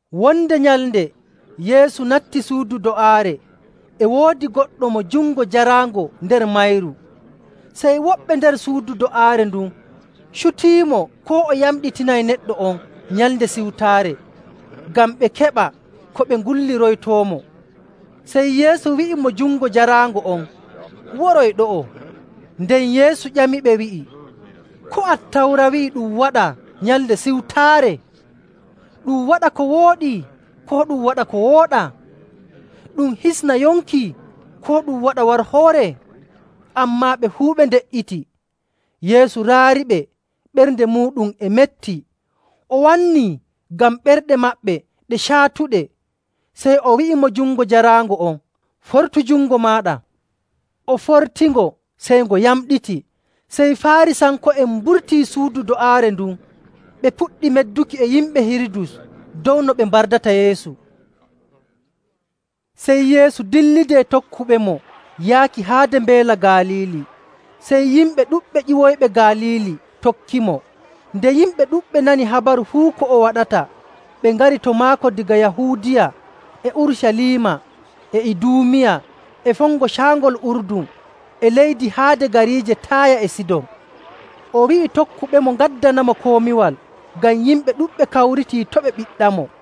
Wonde nyalnde Yeesu natti suudu do'aare, e woodi goɗɗo mo jungo jaraango nder mayru. Sey woɓɓe nder suudu do'aare ndun cutiimo koo o yamɗitinay neɗɗo on Nyalnde Siwtaare ngam ɓe keɓa ko ɓe ngulliroytoomo. Sey Yeesu wi'i mo jungo jaraango on, “Woroy ɗo'o.” Nden Yeesu ƴamiɓe wi'i, “Ko Attawra wi'i ɗum waɗa Nyalnde Siwtaare? Ɗum waɗa ko wooɗi, koo ɗum waɗa ko wooɗaa? Ɗum hisna yonki, koo ɗum waɗa warhoore?” Ammaa ɓe fuu ɓe nde''iti. Yeesu raariɓe ɓernde muuɗum e metti, o wannii ngam ɓerɗe maɓɓe ɗe caatuɗe. Sey o wi'i mo jungo jaraango on, “Fortu jungo maaɗa.” O fortingo, sey ngo yamɗiti. Sey Faarisanko'en mburtii suudu do'aare ndun, ɓe puɗɗi medduki e yimɓe Hirudus dow no ɓe mbardata Yeesu. Sey Yeesu dillidi e tokkuɓemo yaaki haade Mbeela Galiili. Sey yimɓe ɗuɗɓe ƴiwoyiɓe Galiili tokkimo. Nde yimɓe ɗuɗɓe nani habaru fuu ko o waɗata, ɓe ngari to maako daga Yahuudiya, e Urucaliima, e Iduumiya, e fongo Caangol Urdun, e leydi haade gariije Taaya e Sidon. O wi'i tokkuɓemo ngaddanamo komiwal ngam yimɓe ɗuɗɓe kawritii to' ɓe ɓiɗɗamo.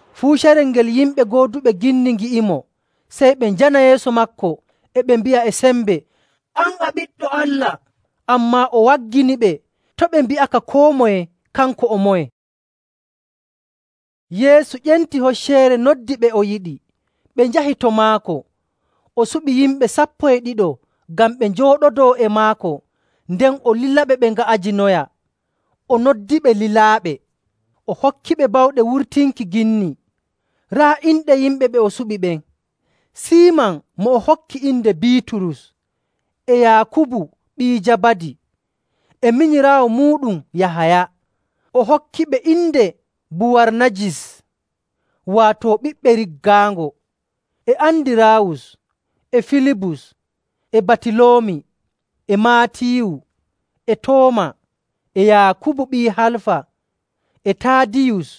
Fuu carel ngel yimɓe gooduɓe ginni ngi'imo, sey ɓe njana yeeso maako e ɓe mbi'a e sembe, “An a Ɓiɗɗo Allah!” Ammaa o wagginiɓe to' ɓe mbi'aka koo moye kanko o moye. Yeesu ƴenti hocceere noddi ɓe o yiɗi. Ɓe njahi to maako. O suɓi yimɓe sappo e ɗiɗo ngam ɓe njooɗodoo e maako, nden o lilaɓe ɓe nga'ajinoya, o noddiɓe lilaaɓe, o hokkiɓe bawɗe wurtinki ginni. Raa inɗe yimɓe ɓe o suɓi ɓen: Siiman mo o hokki inde Biiturus, e Yaakubu ɓii Jabadi, e minyiraawo muuɗum Yahaya, o hokkiɓe inde Buwarnajis, waato Ɓiɓɓe Riggaango, e Andiraawus, e Filibus, e Batiloomi, e Maatiyu, e Tooma, e Yaakubu ɓii Halfa, e Taadiyus,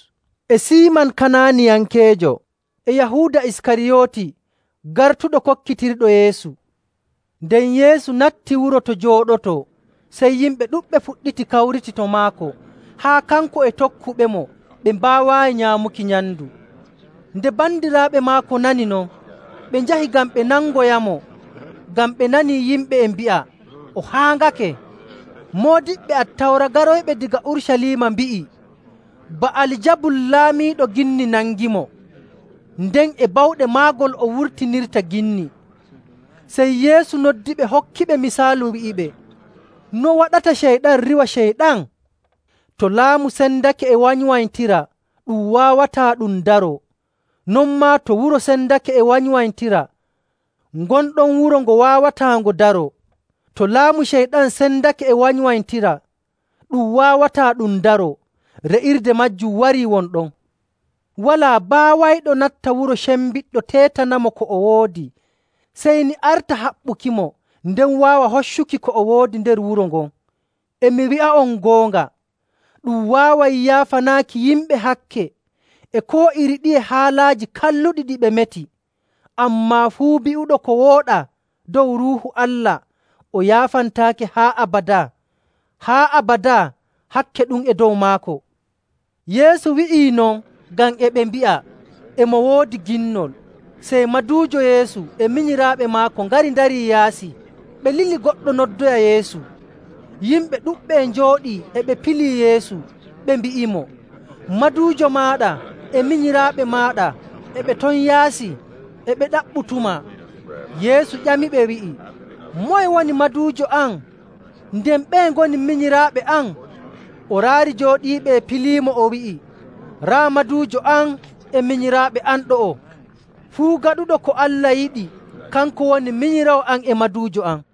e Siiman Kananiyankeejo, e Yahuuda Iskariyooti, gartuɗo kokkitirɗo Yeesu. Nden Yeesu natti wuro to jooɗotoo, sey yimɓe ɗuɗɓe fuɗɗiti kawriti to maako haa kanko e tokkuɓemo ɓe mbaawaayi nyaamuki nyamndu. Nde bandiraaɓe maako nanii non, ɓe njahi ngam ɓe nangoyamo, ngam ɓe nanii yimɓe e mbi'a, “O haaŋake.” Moodiɓɓe Attawra garoyɓe daga Urucaliima mbi'i, “Ba'aljabul laamiiɗo ginni nangimo, nden e bawɗe maagol o wurtinirta ginni.”. Sey Yeesu noddiɓe hokkiɓe misaalu wi'iɓe, “No waɗata Ceyɗan riiwa Ceyɗan? To laamu sendake e wanywanytira, ɗum waawataa ɗum daroo. Non maa to wuro sendake e wanywanytira, ngon ɗon wuro ngo waawataa ngo daroo. To laamu Ceyɗan sendake e wanywanytira, ɗum waawataa ɗum daroo, re'irde maajum warii won ɗon. “Walaa baawayɗo natta wuro cembiɗɗo teetanamo ko o woodi, sey ni arta haɓɓukimo, nden waawa hoccuki ko o woodi nder wuro ngon. “E mi wi'a'on goonga, ɗum waaway yaafanaaki yimɓe hakke e koo iri ɗiye haalaaji kalluɗi ɗi ɓe meti. Ammaa fuu bi'uɗo ko wooɗaa dow Ruuhu Allah, o yaafantaake haa abadaa. Haa abadaa hakke ɗum e dow maako.”. Yeesu wi'ii non ngam e ɓe mbi'a, “E mo woodi ginnol.” Sey maduujo Yeesu e minyiraaɓe maako ngari ndarii yaasi, ɓe lili goɗɗo noddoya Yeesu. Yimɓe ɗuɗɓe e njooɗii e ɓe pilii Yeesu, ɓe mbi'imo, “Maduujo maaɗa e minyiraaɓe maaɗa e ɓe ton yaasi, e ɓe ɗaɓɓutumaa.” Yeesu ƴamiɓe wi'i, “Moye woni maduujo am, nden ɓeye ngoni minyiraaɓe am?” O raari jooɗiiɓe e piliimo o wi'i, “Raa maduujo am e minyiraaɓe am ɗo'o! Fuu gaɗuɗo ko Allah yiɗi, kanko woni minyiraawo am e maduujo am.”